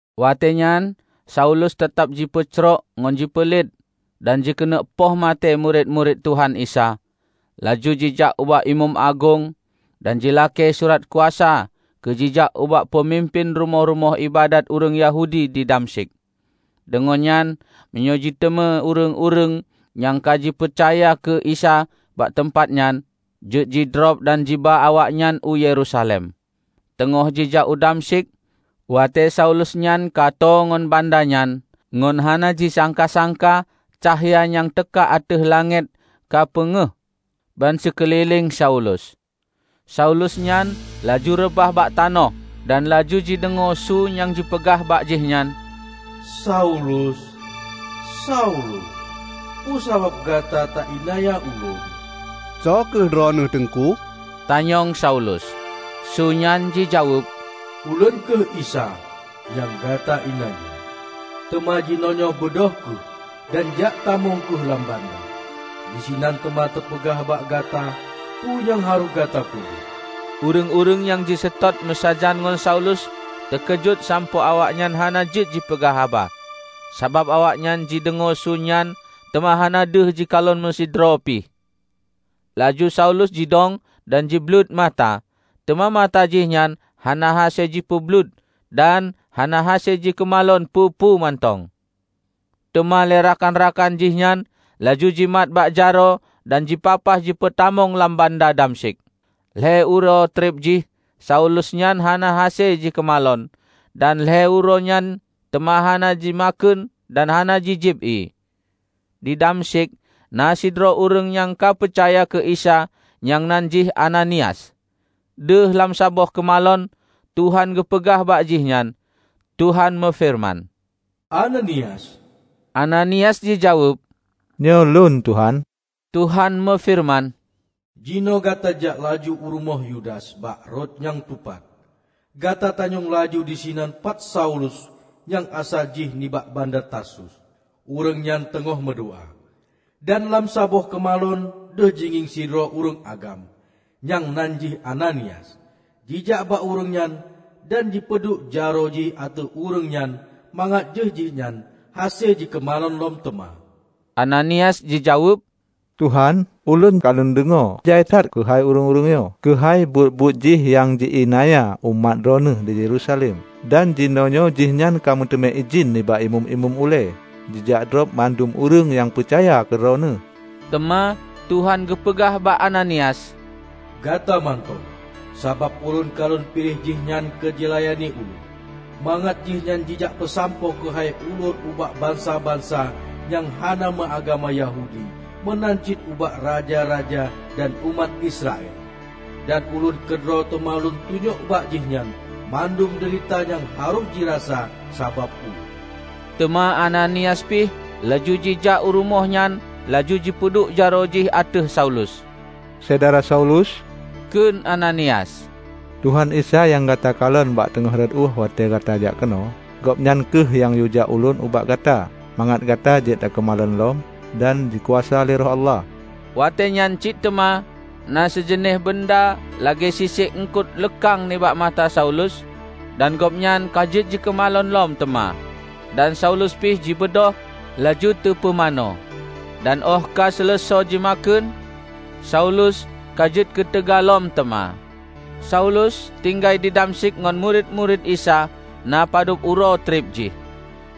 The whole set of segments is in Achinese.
Watée nyan Saulus teutab jipeucrok ngon jipeulet dan jikeuneuk poh maté murit-murit Tuhan Isa, laju jijak ubak imeum agong, dan jilakée surat kuasa keu jijak ubak peumimpén rumoh-rumoh iébadat ureuëng Yahudi di Damsyik, deungon nyan meunyoe jiteumé ureuëng-ureuëng nyang ka jipeucaya keu Isa bak teumpat nyan, jeuet jidrob dan jiba awaknyan u Yerusalem. Teungoh jijak u Damsyik, watée Saulus nyan ka tô ngon banda nyan, ngon hana jisangka-sangka cahya nyang teuka ateueh langét ka peungéh ban sikeulileng Saulus. Saulus nyan laju reubah bak tanoh dan laju jideungoe su nyang jipeugah bak jihnyan, "Saulus, Saulus! Peue sabab gata taiénanya Ulôn?" "Soe kheueh Droeneueh, Teungku?" tanyong Saulus. Su nyan jijaweueb, "Ulôn kheueh Isa, nyang gata iénanya. Teuma jinoenyoe beudôh kheueh dan jak tamong kheueh lam banda. Disinan teuma teupeugah bak gata peue nyang harôh gata peubuet." Ureuëng-ureuëng nyang jiseutôt meusajan ngon Saulus teukeujot sampoe awaknyan hana jeuet jipeugah haba; sabab awaknyan jideungoe su nyan teuma hana deuh jikalon meusidroe pih. Laju Saulus jidong dan jibleuet mata, teuma mata jih nyan hana hase jipeubleuet dan hana hase jikeumalon peue-peue mantong. Teuma lé rakan-rakan jihnyan laju jimat bak jaroe dan jipapah jipeutamong lam banda Damsyik. Lhée uroe treb jih Saulus nyan hana hase jikeumalon dan lhée uroe nyan teuma hana jimakheun dan hana jijieb ié. Di Damsyik na sidroe ureuëng nyang ka peucaya keu Isa nyang nan jih Ananias. Deuh lam saboh keumalon, Tuhan geupeugah bak jihnyan, Tuhan meufeureuman, "Ananias!" Ananias jijaweueb, "Nyoe lôn, Tuhan." Tuhan meufeureuman, "Jinoe gata jak laju u rumoh Yudas bak Rot nyang Tupat. Gata tanyong laju disinan pat Saulus nyang asai jih nibak banda Tarsus. Ureuëng nyan teungoh meudoá, dan lam saboh keumalon deuh jingieng sidroe ureuëng agam, nyang nan jih Ananias, jijak bak ureuëng nyan dan jipeuduek jaroe jih ateueh ureuëng nyan mangat jeuet jihnyan hase jikeumalon lom teuma." Ananias jijaweueb, "Tuhan, ulôn ka lôn deungoe jai that keuhai ureuëng nyoe, keuhai buet-buet jih nyang ji iénanya umat Droeneueh di Yerusalem. Dan jinoenyoe jihnyan ka meuteumé idhin nibak imeum-imeum ulée jijak drob mandum ureuëng nyang peucaya keu Droeneueh." Teuma Tuhan geupeugah bak Ananias, "Gata mantong! Sabab Ulôn ka Lôn piléh jihnyan keu jilayani Ulôn, mangat jihnyan jijak peusampoe keuhai Ulôn ubak bansa-bansa nyang hana meu agama Yahudi meunan cit ubak raja-raja dan umat Israel. Dan Ulôn keudroe teuma Lôn tunyok bak jihnyan mandum deurita nyang harôh jirasa sabab Ulôn." Teuma Ananias pih laju jijak u rumoh nyan laju jipeuduek jaroe jih ateueh Saulus. "Syedara Saulus," kheun Ananias, "Tuhan Isa nyang gata kalon bak teungoh rot ueh watée gata jak keunoe, Gobnyan kheueh nyang yue jak ulôn bak gata mangat gata jeuet gata keumalon lom dan jikuasa lé Roh Allah." Watée nyan cit teuma na sijeuneh beunda lagée sisek eungkot leukang nibak mata Saulus dan gobnyan ka jeuet jikeumalon lom teuma. Dan Saulus pih jibeudôh, laju teupumanö. Dan óh ka seuleusoe jimakheun, Saulus ka jeuet keuteuga lom teuma. Saulus tinggai di Damsyik ngon murit-murit Isa na padub uroe treb jih.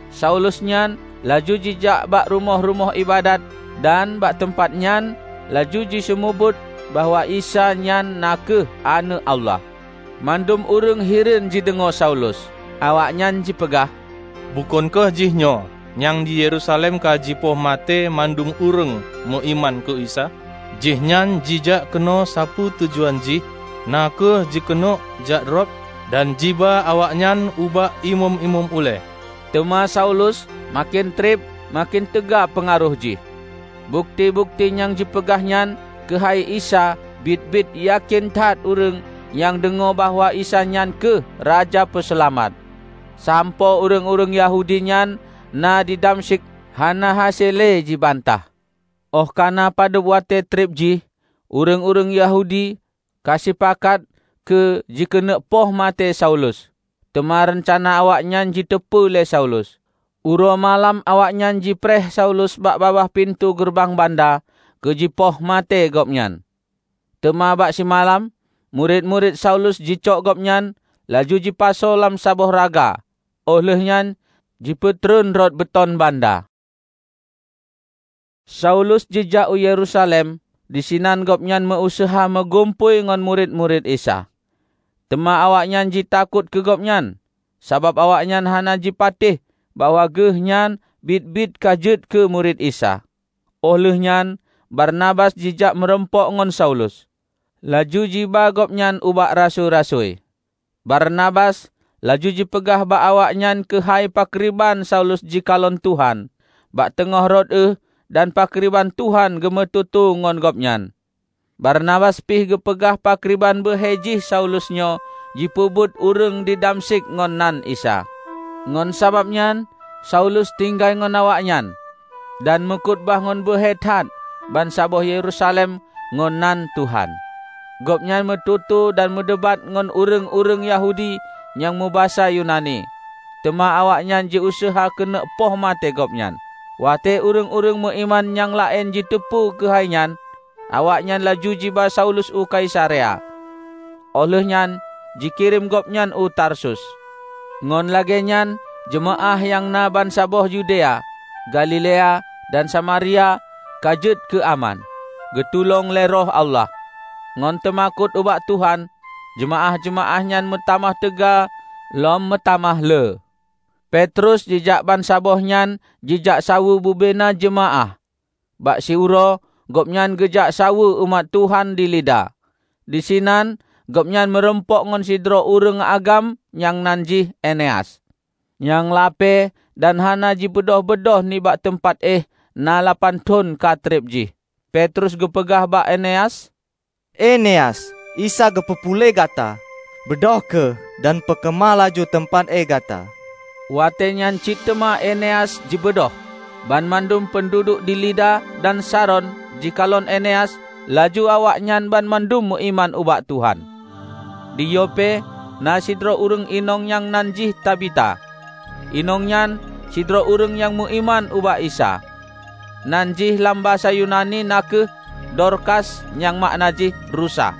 Saulus nyan laju jijak bak rumoh-rumoh iébadat dan bak teumpat nyan laju jiseumeubeuet bahwa Isa nyan na kheueh Aneuëk Allah. Mandum ureuëng hireuen jideungoe Saulus. Awaknyan jipeugah, "Bukon kheueh jihnyoe nyang di Yerusalem ka jipoh maté mandum ureuëng meuiman keu Isa? Jihnyan jijak keunoe sapeue tujuan jih na kheueh jikeuneuk jakdrob dan jiba awaknyan ubak imeum-imeum ulée!" Teuma Saulus maken treb maken teuga peungaroh jih. Bukeuti-bukeuti nyang jipeugah nyan keuhai Isa biet-biet yakén that ureuëng nyang deungoe bahwa Isa nyan kheueh Raja Peuseulamat, sampoe ureuëng-ureuëng Yahudi nyang na di Damsyik hana hase le jibantah. Óh ka na padub watée treb jih ureuëng-ureuëng Yahudi ka sipakat keu jikeuneuk poh maté Saulus. Teuma reuncana awaknyan jiteupeue lé Saulus. Uroe malam awaknyan jipreh Saulus bak babah pintoe geureubang banda keu jipoh maté gobnyan. Teuma bak simalam, murit-murit Saulus jicok gobnyan, laju jipasoe lam saboh raga oh lheueh nyan jipeutreun rot beuton banda. Saulus jijak u Yerusalem, disinan gobnyan meu-useuha meugumpôi ngon murit-murit Isa. Teuma awaknyan jitakot keu gobnyan, sabab awaknyan hana jipatéh bahwa geuh nyan biet-biet ka jeuet keu murit Isa. Óh lheueh nyan Barnabas jijak meurumpok ngon Saulus, laju jiba gobnyan ubak rasui-rasui. Barnabas laju jipeugah bak awaknyan keuhai pakriban Saulus jikalon Tuhan bak teungoh rot euh dan pakriban Tuhan geumeututoe ngon gobnyan. Barnabas pih geupeugah pakriban beuhe jih Saulus nyoe jipeubeuet ureuëng di Damsyik ngon nan Isa. Ngon sabab nyan Saulus tinggai ngon awaknyan, dan meukhutubah ngon beuhe that bansaboh Yerusalem ngon nan Tuhan. Gobnyan meututoe dan meudebat ngon ureuëng-ureuëng Yahudi nyang meubasa Yunani, teuma awaknyan jiuseuha keuneuk poh maté gobnyan. Watée ureuëng-ureuëng meuiman nyang laén jiteupeue keuhai nyan, awaknyan laju jiba Saulus u Kaisarea, óh lheueh nyan jikirém gobnyan u Tarsus. Ngon lagée nyan jeumaáh nyang na bansaboh Yudea, Galilea, dan samaria ka jeuet keu aman. Geutulông lé Roh Allah, ngon teumakot ubak Tuhan, jeumaáh-jeumaáh nyan meutamah teuga lom meutamah le. Petrus jijak bansaboh nyan jijak saweue bubena jeumaáh. Bak siuroe gobnyan geujak saweue umat Tuhan di Lida. Disinan gobnyan meurumpok ngon sidroe ureuëng agam nyang nan jih Eneas, nyang lapée dan hana jibeudôh-beudôh nibak teumpat éh na lapan thon ka treb jih. Petrus geupeugah bak Eneas, "Eneas, Isa geupeu puléh gata. Beudôh kheueh dan peukeumah laju teumpat éh gata." Watée nyan cit teuma Eneas jibeudôh. Banmandum peunduduek di Lida dan Saron jikalon Eneas, laju awaknyan banmandum meuiman ubak Tuhan. Di Yope na sidroe ureuëng inong nyang nan jih Tabita. Inong nyan sidroe ureuëng nyang meuiman ubak Isa. (Nan jih lam basa Yunani na kheueh Dorkas nyang makna jih rusa.)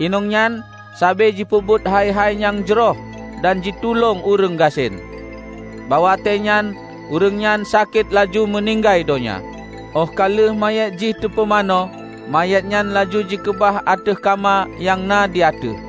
Inong nyan sabe jipeubuet hai-hai nyang jroh dan jitulông ureuëng gasien. Bak watée nyan ureuëng nyan sakét laju meuninggai donya. Óh ka lheueh manyét jih teupumanö, manyét nyan laju jikeubah ateueh kama nyang na di ateueh.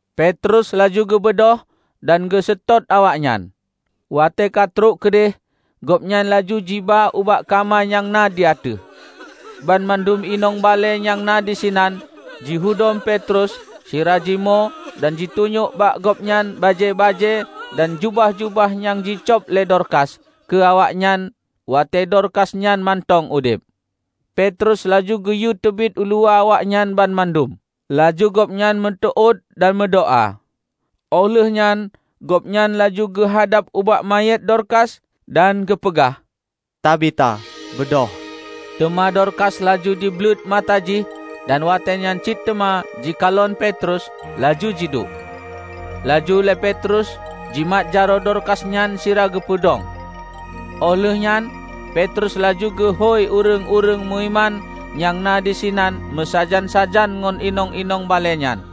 Petrus laju geubeudôh dan geuseutôt awaknyan. Watée ka trok keudeh, gobnyan laju jiba ubak kama nyang na di ateueh. Banmandum inong balée nyang na disinan jihudom Petrus sira jimoe dan jitunyok bak gobnyan bajée-bajée dan jubah-jubah nyang jicöb lé Dorkas keu awaknyan watée Dorkas nyan mantong udeb. Petrus laju geuyue teubiet uluwa awaknyan banmandum, laju gobnyan meuteuôt dan meudoá. Óh lheueh nyan gobnyan laju geuhadab ubak manyét Dorkas dan geupeugah, "Tabita, beudôh!" Teuma Dorkas laju jibleuet mata jih dan watée nyan cit teuma jikalon Petrus, laju jiduek. Laju lé Petrus jimat jaroe Dorkas nyan sira geupeudong. Óh lheueh nyan Petrus laju geuhôi ureuëng-ureuëng meuiman nyang na disinan meusajan-sajan ngon inong-inong balée nyan,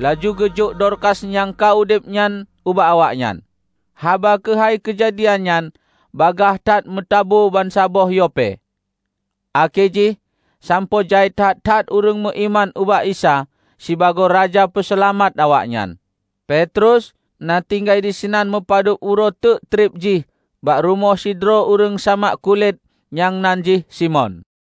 laju geujok Dorkas nyang ka udeb nyan ubak awaknyan. Haba keuhai keujadian nyan bagaih that meutabu bansaboh Yope, akhé jih sampoe jai that-that ureuëng meuiman ubak Isa sibagoe Raja Peuseulamat awaknyan. Petrus na tinggai disinan meupadub uroe teuk treb jih bak rumoh sidroe ureuëng samak kulét nyang nan jih Simon.